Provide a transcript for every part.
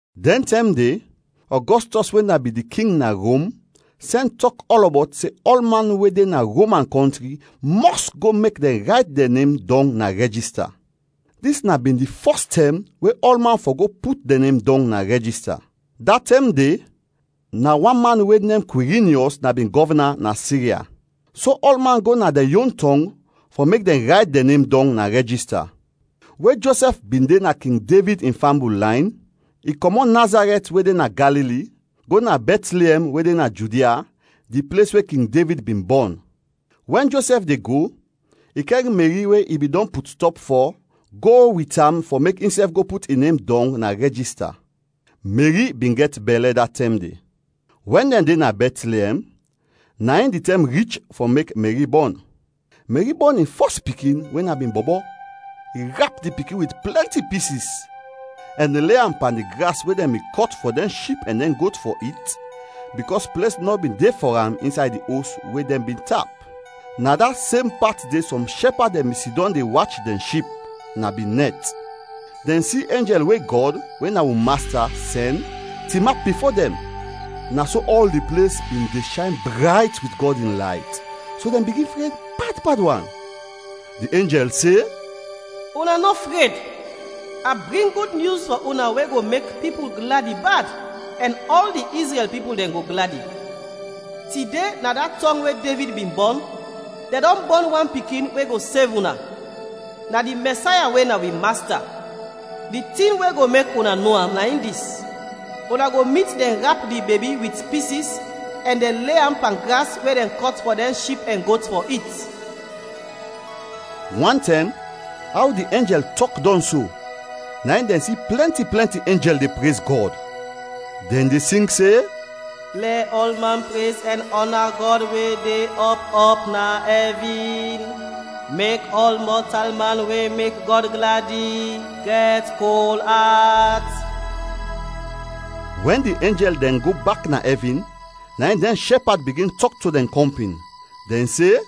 Dɛn tɛm de, Ɔgɔstɔs we na bin di king na Rom sɛn tɔk ɔlɔbɔt se ɔlman we de na Roman kɔntri mɔs go mek dɛn rayt dɛn nem dɔng na rɛjista. Dis na bin di fɔs tɛm we ɔlman fɔ go put dɛn nem dɔng na rɛjista. Da tɛm de, na wan man we nem Kwirinyɔs na bin gɔvna na Sirya. So ɔlman go na dɛn yon tɔng fɔ mek dɛn rayt dɛn nem dɔng na rɛjista. We Josɛf bin de na King Devid in fambul layn, i kɔmɔt Nazarɛt we de na Galili, go na Bɛtliɛm we de na Judia, di ples we King Devid bin bɔn. Wɛn Josɛf de go, i kɛr Meri we i bin dɔn put stɔp fɔ go wit am fɔ mek insɛf go put in nem dɔng na rɛjista. Meri bin gɛt bɛlɛ da tɛm de. Wɛn dɛn de na Bɛtliɛm, na in di tɛm rich fɔ mek Meri bɔn. Meri bɔn in fɔs pikin we na bin bɔbɔ. I rap di pikin wit plɛnti pisis, ɛn le am pan di gras we dɛn bin kɔt fɔ dɛn ship ɛn dɛn got fɔ it, bikɔs ples nɔ bin de fɔ am insay di os we dɛn bin tap. Na da sem pat de, sɔm shɛpad dɛn bin sidɔm de wach dɛn ship, na bin nɛt. Dɛn si enjɛl we Gɔd, we na wi Masta, sɛn, tinap bifo dɛn. Na so ɔl di ples bin de shayn brayt wit Gɔd in layt, so dɛn bigin fred bad bad wan. Di enjɛl se, “Una nɔ fred! A bring gud nyus fɔ una we go mek pipul gladi bad ɛn ɔl di Izrɛl pipul dɛn go gladi. Tide na da tɔng we Devid bin bɔn, dɛn dɔn bɔn Wan Pikin we go sev una. Na di Mɛsaya we na wi Masta. Di tin we go mek una no am, na in dis: una go mit dɛn rap di bebi wit pisis ɛn dɛn le am pan gras we dɛn kɔt fɔ dɛn ship ɛn got fɔ it.” Wantɛm, aw di enjɛl tɔk dɔn so, na in dɛn si plɛnti plɛnti enjɛl de prez Gɔd, dɛn de sing se, “Lɛ ɔlman prez ɛn ɔna Gɔd we de ɔp ɔp na ɛvin, mek ɔl mɔtalman we mek Gɔd gladi, gɛt kol at!” Wɛn di enjɛl dɛn go bak na ɛvin, na in dɛn shɛpad bigin tɔk to dɛn kɔmpin, dɛn se,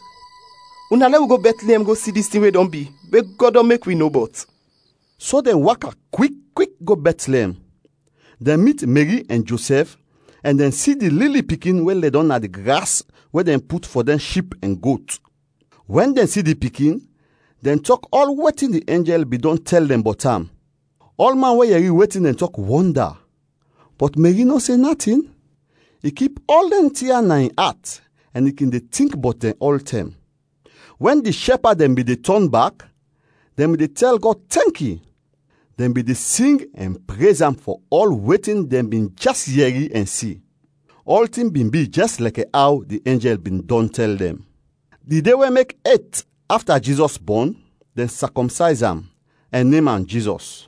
“Una lɛ wi go Bɛtliɛm go si dis tin we dɔn bi, we Gɔd dɔn mek wi no bɔt.” So dɛn waka kwik kwik go Bɛtliɛm. Dɛn mit Meri ɛn Josɛf ɛn dɛn si di lili pikin we ledɔm na di gras we dɛn put fɔ dɛn ship ɛn got. Wɛn dɛn si di pikin, dɛn tɔk ɔl wetin di enjɛl bin dɔn tɛl dɛn bɔt am. Ɔlman we yɛri wetin dɛn tɔk, wɔnda. Bɔt Meri nɔ se natin, i kip ɔl dɛn tin ya na in at ɛn i kin de tink bɔt dɛn ɔltɛm. Wɛn di shɛpad dɛn bin de tɔn bak, dɛn bin de tɛl Gɔd tɛnki, dɛn bin de sing ɛn prez am fɔ ɔl wetin dɛn bin jɛs yɛri ɛn si. Ɔltin bin bi jɛs lɛkɛ aw di enjɛl bin dɔn tɛl dɛn. Di de we mek et afta Jizɔs bɔn, dɛn sakɔmsayz am, ɛn nem am Jizɔs.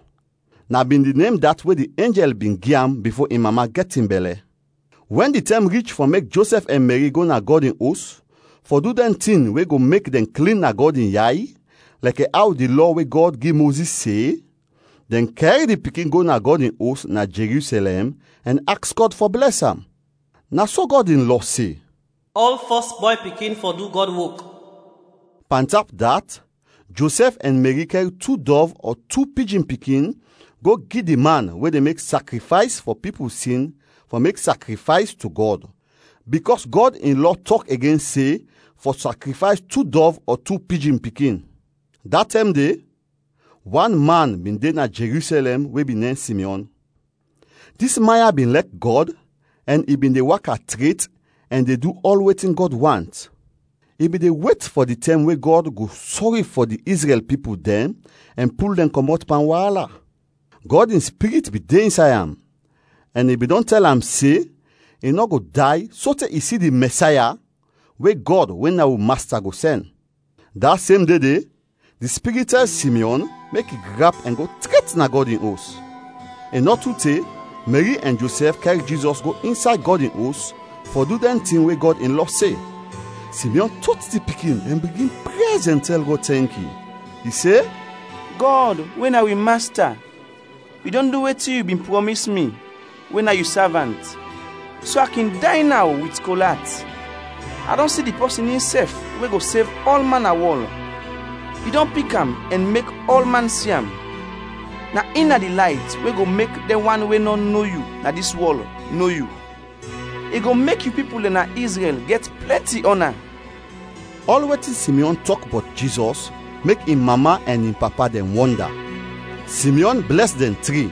Na bin di nem dat we di enjɛl bin gi am bifo in mama gɛt in bɛlɛ. Wɛn di tɛm rich fɔ mek Josɛf ɛn Meri go na Gɔd in Os fɔ du dɛn tin we go mek dɛn klin na Gɔd in yay lɛkɛ aw di Lɔ we Gɔd gi Mozis se, dɛn kɛr di pikin go na Gɔd in Os na Jerusɛlɛm ɛn aks Gɔd fɔ blɛs am. Na so Gɔd in lɔ se, “Ɔl fɔs bɔy pikin fɔ du Gɔd wok.” Pantap dat, Josɛf ɛn Meri kɛr tu dɔv ɔ tu pijin pikin go gi di man we de mek sakrifays fɔ pipul sin fɔ mek sakrifays to Gɔd, bikɔs Gɔd in lɔ tɔk igen se fɔ sakrifays tu dɔv ɔ tu pijin pikin. Da tɛm de, wan man bin de na Jerusɛlɛm we bin nem Simyɔn. Dis man ya bin lɛk Gɔd ɛn i bin de waka tret ɛn de du ɔl wetin Gɔd want. I bin de wet fɔ di tɛm we Gɔd go sɔri fɔ di Izrɛl pipul dɛn ɛn pul dɛn kɔmɔt pan waala. Gɔd in Spirit bin de insay am, ɛn i bin dɔn tɛl am se i nɔ go day sote i si di Mɛsaya we Gɔd we na wi Masta go sɛn. Da sem de de, di Spirit tɛl Simyɔn mek i grap ɛn go tret na Gɔd in Os. I nɔ tu te, Meri ɛn Josɛf kɛr Jizɔs go insay Gɔd in Os fɔ du dɛn tin we Gɔd in lɔ se. Simyɔn tot di pikin ɛn bigin prez ɛn tɛl Gɔd tɛnki. I se: “Gɔd, we na wi Masta, yu dɔn du wetin yu bin prɔmis mi, we na yu savant, so a kin day naw wit kol at. A dɔn si di pɔsin insɛf we go sev ɔlman na wɔl. Yu dɔn pik am ɛn mek ɔlman si am. Na in na di layt we go mek dɛn wan we nɔ no yu na dis wɔl, no yu; i go mek yu pipul dɛn na Izrɛl gɛt plɛnti ɔna.” Ɔl wetin Simyɔn tɔk bɔt Jizɔs mek in mama ɛn in papa dɛn wɔnda. Simyɔn blɛs dɛn tri,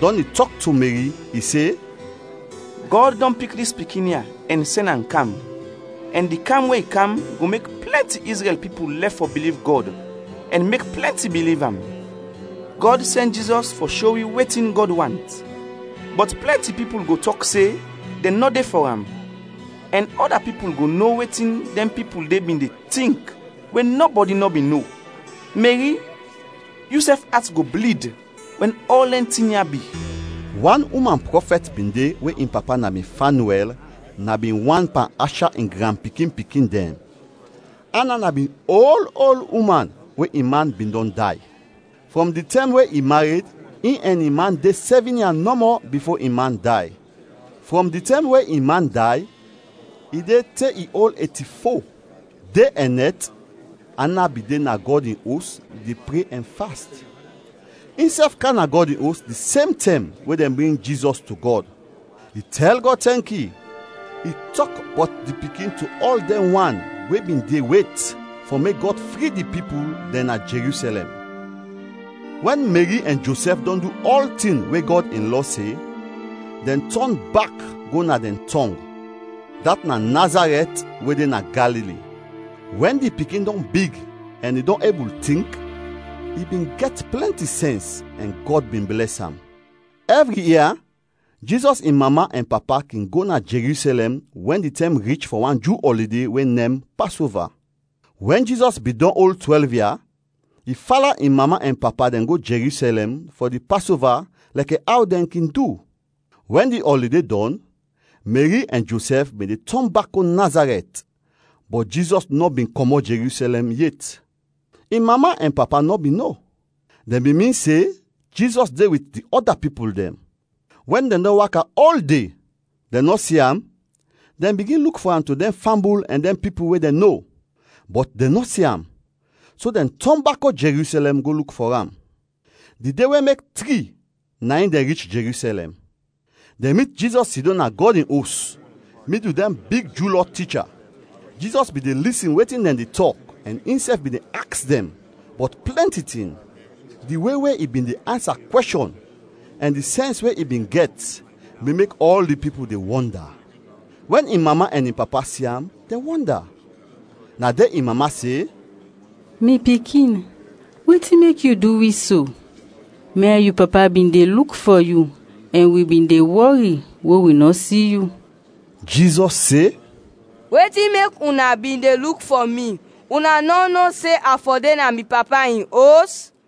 dɔn i tɔk to Meri, i se, “Gɔd dɔn pik dis pikin ya ɛn sɛn am kam, ɛn di kam we i kam go mek plɛnti Izrɛl pipul lɛf fɔ biliv Gɔd ɛn mek plɛnti biliv am. Gɔd sɛn Jizɔs fɔ sho wi wetin Gɔd want, bɔt plɛnti pipul go tɔk se dɛn nɔ de fɔ am, ɛn ɔda pipul go no wetin dɛn pipul de bin de tink we nɔbɔdi nɔ bin no. Meri, yusɛf at go blid wɛn ɔl dɛn tin ya bi.” Wan uman prɔfɛt bin de we in papa na bin Fanyuɛl, na bin wan pan Asha in granpikin-pikin dɛn; Ana na bin ol ol uman we in man bin dɔn day. Frɔm di tɛm we i mared, in ɛn in man de sɛvin ia nɔmɔ bifo in man day. Frɔm di tɛm we in man day, i de te i ol eti-fo. De ɛn nɛt Ana bin de na Gɔd in Os de pre ɛn fast. Insɛf kam na Gɔd in Os di sem tɛm we dɛn bring Jizɔs to Gɔd. I tɛl Gɔd tɛnki. I tɔk bɔt di Pikin to ɔl dɛn wan we bin de wet fɔ mek Gɔd fri di pipul dɛn na Jerusɛlɛm. Wɛn Meri ɛn Josɛf dɔn du ɔltin we Gɔd in lɔ se, dɛn tɔn bak go na dɛn tɔng, dat na Nazarɛt we de na Galili. Wɛn di pikin dɔn big ɛn i dɔn ebul tink, i bin gɛt plɛnti sɛns ɛn Gɔd bin blɛs am. Ɛvri ia Jizɔs in mama ɛn papa kin go na Jerusɛlɛm wɛn di tɛm rich fɔ wan Ju ɔlide we nem Pasova. Wɛn Jizɔs bin dɔn ol twɛlv ia, i fala in mama ɛn papa dɛn go Jerusɛlɛm fɔ di Pasova lɛkɛ aw dɛn kin du. Wɛn di ɔlide dɔn, Meri ɛn Josɛf bin de tɔn bak go Nazarɛt, bɔt Jizɔs nɔ bin kɔmɔt Jerusɛlɛm yet. In mama ɛn papa nɔ bin no. Dɛn bin min se Jizɔs de wit di ɔda pipul dɛn. Wɛn dɛn dɔn waka ol de, dɛn nɔ si am, dɛn bigin luk fɔ am to dɛn fambul ɛn dɛn pipul we dɛn no. Bɔt dɛn nɔ si am; so dɛn tɔn bak go Jerusɛlɛm go luk fɔ am. Di de we mek tri na in dɛn rich Jerusɛlɛm. Dɛn mit Jizɔs sidɔm na Gɔd in Os midul dɛn big Ju Lɔ ticha. Jizɔs bin de lisin wetin dɛn de tɔk ɛn insɛf bin de aks dɛn bɔt plɛnti tin. Di we we i bin de ansa kwɛshɔn ɛn di sɛns we i bin gɛt bin mek ɔl di pipul dɛn wɔnda. Wɛn in mama ɛn in papa si am, dɛn wɔnda. Na de in mama se, “Mi pikin, wetin mek yu du wi so? Mi ɛn yu papa bin de luk fɔ yu ɛn wi bin de wɔri we wi nɔ si yu.” Jizɔs se, “Wetin mek una bin de luk fɔ mi? Una nɔ no se a fɔ de na mi Papa in Os?”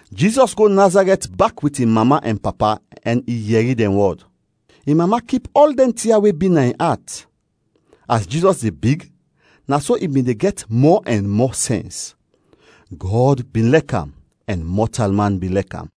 Jizɔs go Nazarɛt bak wit in mama ɛn papa ɛn i yɛri dɛn wɔd. In mama kip ɔl dɛn tin ya we bi na in at. As Jizɔs de big, na so i bin de gɛt mɔ ɛn mɔ sɛns. Gɔd bin lɛk am; ɛn mɔtalman bin lɛk am.